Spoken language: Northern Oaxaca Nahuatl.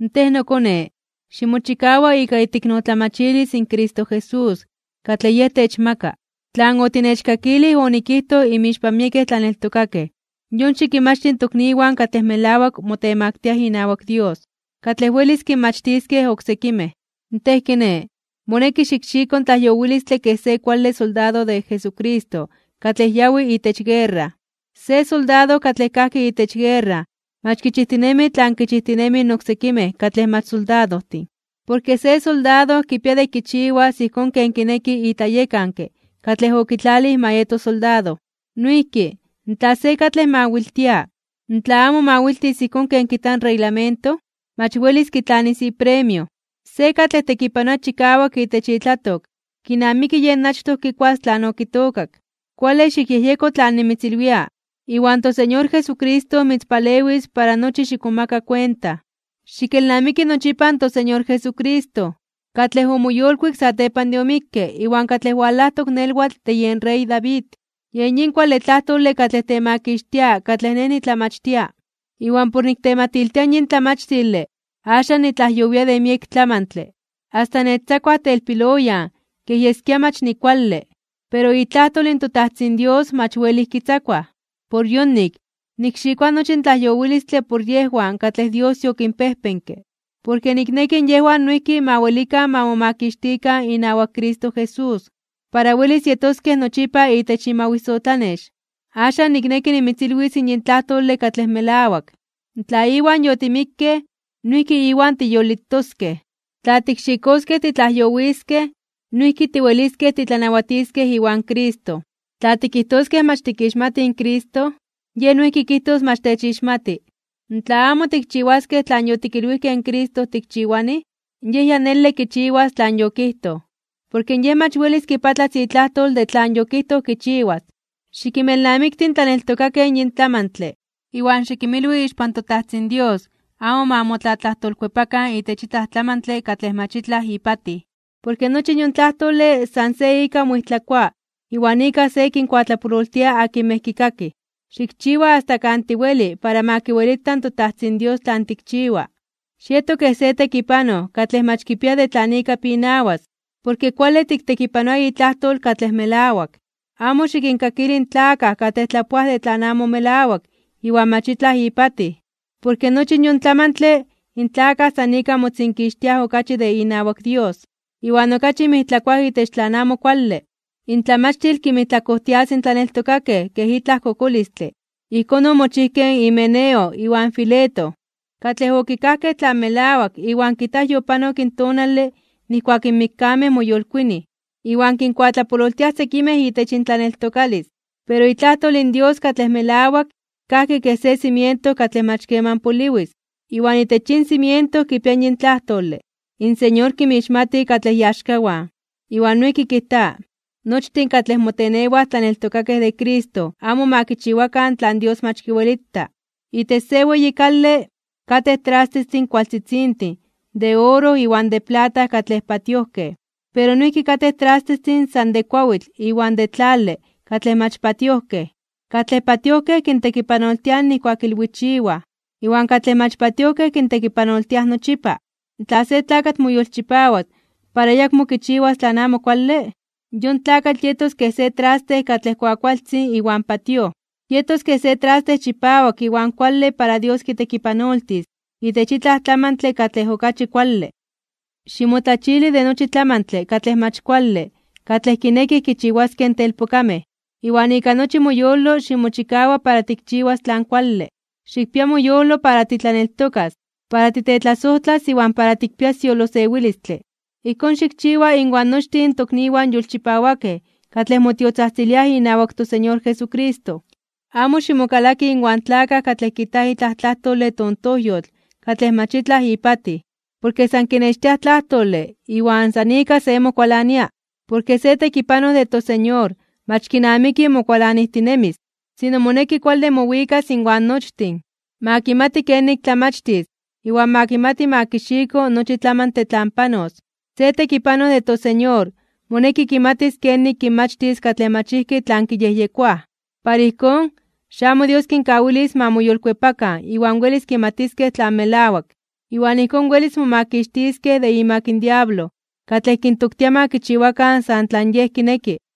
Tej, nokone, ximochikawa ika iteiknotlamachilis in Cristo Jesús, katlej Yej techmaka. Tlan otinechkakilij onikijtoj inmixpan miekej tlaneltokakej, yon xikinmachti in tokniwan katlej melawak motemaktiaj inawak Dios, katlej welis kinmachtiskej oksekimej. Tej, kiné, moneki xikxiko in tlaiyowilistle kej se kuale soldado de Jesucristo katlej yawi itech guerra. Se soldado katlej kajki itech guerra mach kichijtinemi tlan kichijtinemij oksekimej katlej mach soldadojtin. Porke se soldado kipia de kichiwas ijkón ken kineki itlayekanke katlej okitlalij ma yeto soldado. Noijki, tla se katlej mawiltia, tla amo mawiltis ijkón ken kijta in reglamento, mach welis kitlanis ipremio. Se katlej tekipanoa chikawak itech itlatok, kinamiki yej achtoj kikuas tlan okitookak. Kuale xikyejyeko tlan nimitzilwia, iwan toSeñor Jesucristo mitzpalewis para nochi xikmomaka kuenta. Xikelnamiki nochipa in toSeñor Jesucristo, katlej omoyolkuik satepan de omikke iwan katlej walajtok nelwatl de yen rey David. Yen yin kuale tlajtole katlej temakixtia katlej nej nitlamachtia. Iwan por niktematiltia yin tlamachtile axan nitlajyowia de miek tlamantle, asta nechtzakuaj telpiloyan kej yeskia mach nikuale. Pero itlajtol in toTajtzin Dios mach welij kitzakuaj. Por yonik, nikxikoa nochi tlajyowilistle por yejwan katlej Dios yokinpejpenke. Porke nikneki yejwan noijki ma welikan ma momakixtikan inawak Cristo Jesús, para welis yetoskej nochipa itech imawisotlanex. Axan, nikneki nimitzilwis yin tlajtole katlej melawak: Tla Iwan yotimikkej, noijki Iwan tiyolitoskej. Tla tikxikoskej titlajyowiskej, noijki tiweliskej titlanawatiskej iwan Cristo. Tla tikijtoskej mach tikixmatij in Cristo, Yej noijki kijtos mach techixmati. Tla amo tikchiwaskej tlan yotikilwijkej in Cristo tikchiwanij, Yej ya nele kichiwas tlan yokijtoj, porke Yej mach welis kipatlas itlajtol de tlan yokijtoj kichiwas. Xikinmelnamikti in tlaneltokakej yin tlamantle, iwan xikinmilwi ixpan toTajtzin Dios amo ma motlatlajtolkuepakan itech itlaj tlamantle katlej mach itlaj ipatij. Porke nochi yon tlajtole san se ika moijtlakoa iwan ika se kinkuatlapololtia akinmej kikakij. Xikchiwa asta kan tiweli para ma kiwelita in toTajtzin Dios tlan tikchiwa. Xieto kej se tekipanoj katlej mach kipia de tlan ika pinawas, porke kuale tiktekipanoa itlajtol katlej melawak. Amo xikinkakili in tlakaj katlej tlapoaj de tlan amo melawak iwan mach itlaj ipatij. Porke nochi yon tlamantle in tlakaj san ika motzinkixtiaj okachi de inawak Dios, iwan okachi mijtlakoaj itech tlan amo kuale. Intlamachtil kinmijtlakojtias in tlaneltokakej kej itlaj kokolistle. Ijkón omochijkej in Himeneo iwan Fileto, katlej okikajkej tlan melawak iwan kijtaj yopanok in tonale nijkuak in mikkamej moyolkuinij. Iwan kinkuatlapololtiaj sekimej itech intlaneltokalis. Pero itlajtol in Dios katlej melawak kajki kej se cimiento katlej mach keman poliwis. Iwan itech yin cimiento kipia yin tlajtole: “In Señor kinmixmati katlej iaxkawan.” Iwan noijki kijta: “Nochtin katlej motenewaj tlaneltokakej de Cristo amo ma kichiwakan tlan Dios mach kiwelita.” Itech se weyi kale, katej trastestin kuakualtzitzintin de oro iwan de plata katlej patiojkej. Pero noijki katej trastestin san de kuawitl iwan de tlale (barro) katlej mach patiojkej. Katlej patiojkej kintekipanoltiaj nijkuak ilwichiwaj, iwan katlej mach patiojkej kintekipanoltiaj nochipa. Tla se tlakatl moyolchipawas para ayakmo kichiwas tlan amo kuale, yon tlakatl yetos kej se traste katlej kuakualtzin iwan patíoj. Yetos kej se traste chipawak iwan kuale para Dios kitekipanoltis itech itlaj tlamantle katlej okachi kuale. Ximotlachili de nochi tlamantle katlej mach kuale katlej kinekij kichiwaskej in telpokamej, iwan ika nochi moyolo ximochikawa para tikchiwas tlan kuale, xikpia moyolo para titlaneltokas, para titetlasojtlas iwan para tikpias yolosewilistle. Ijkón xikchiwa inwan nochtin in tokniwan yolchipawakej katlej motiotzajtziliaj inawak toSeñor Jesucristo. Amo ximokalaki inwan tlakaj katlej kijtaj itlaj tlajtole tontojyotl katlej mach itlaj ipatij. Porke san kinextiaj tlajtole iwan san ika se mokualania. Porke se tekipanoj de toSeñor mach kinamiki mokualanijtinemis. Sino, moneki kuale mowikas inwan nochtin. Ma kimati kenik tlamachtis iwan ma kimati ma kixiko nochi tlamantle tlan panos. Se tekipanoj de toSeñor moneki kimatis kenik kinmachtis katlej mach ijki tlan kiyejyekoaj, para ijkón, xamo Dios kinkawilis ma moyolkuepakan iwan welis kimatiskej tlan melawak. Iwan ijkón welis momakixtiskej de imak in diablo katlej kintoktia ma kichiwakan san tlan yej kineki.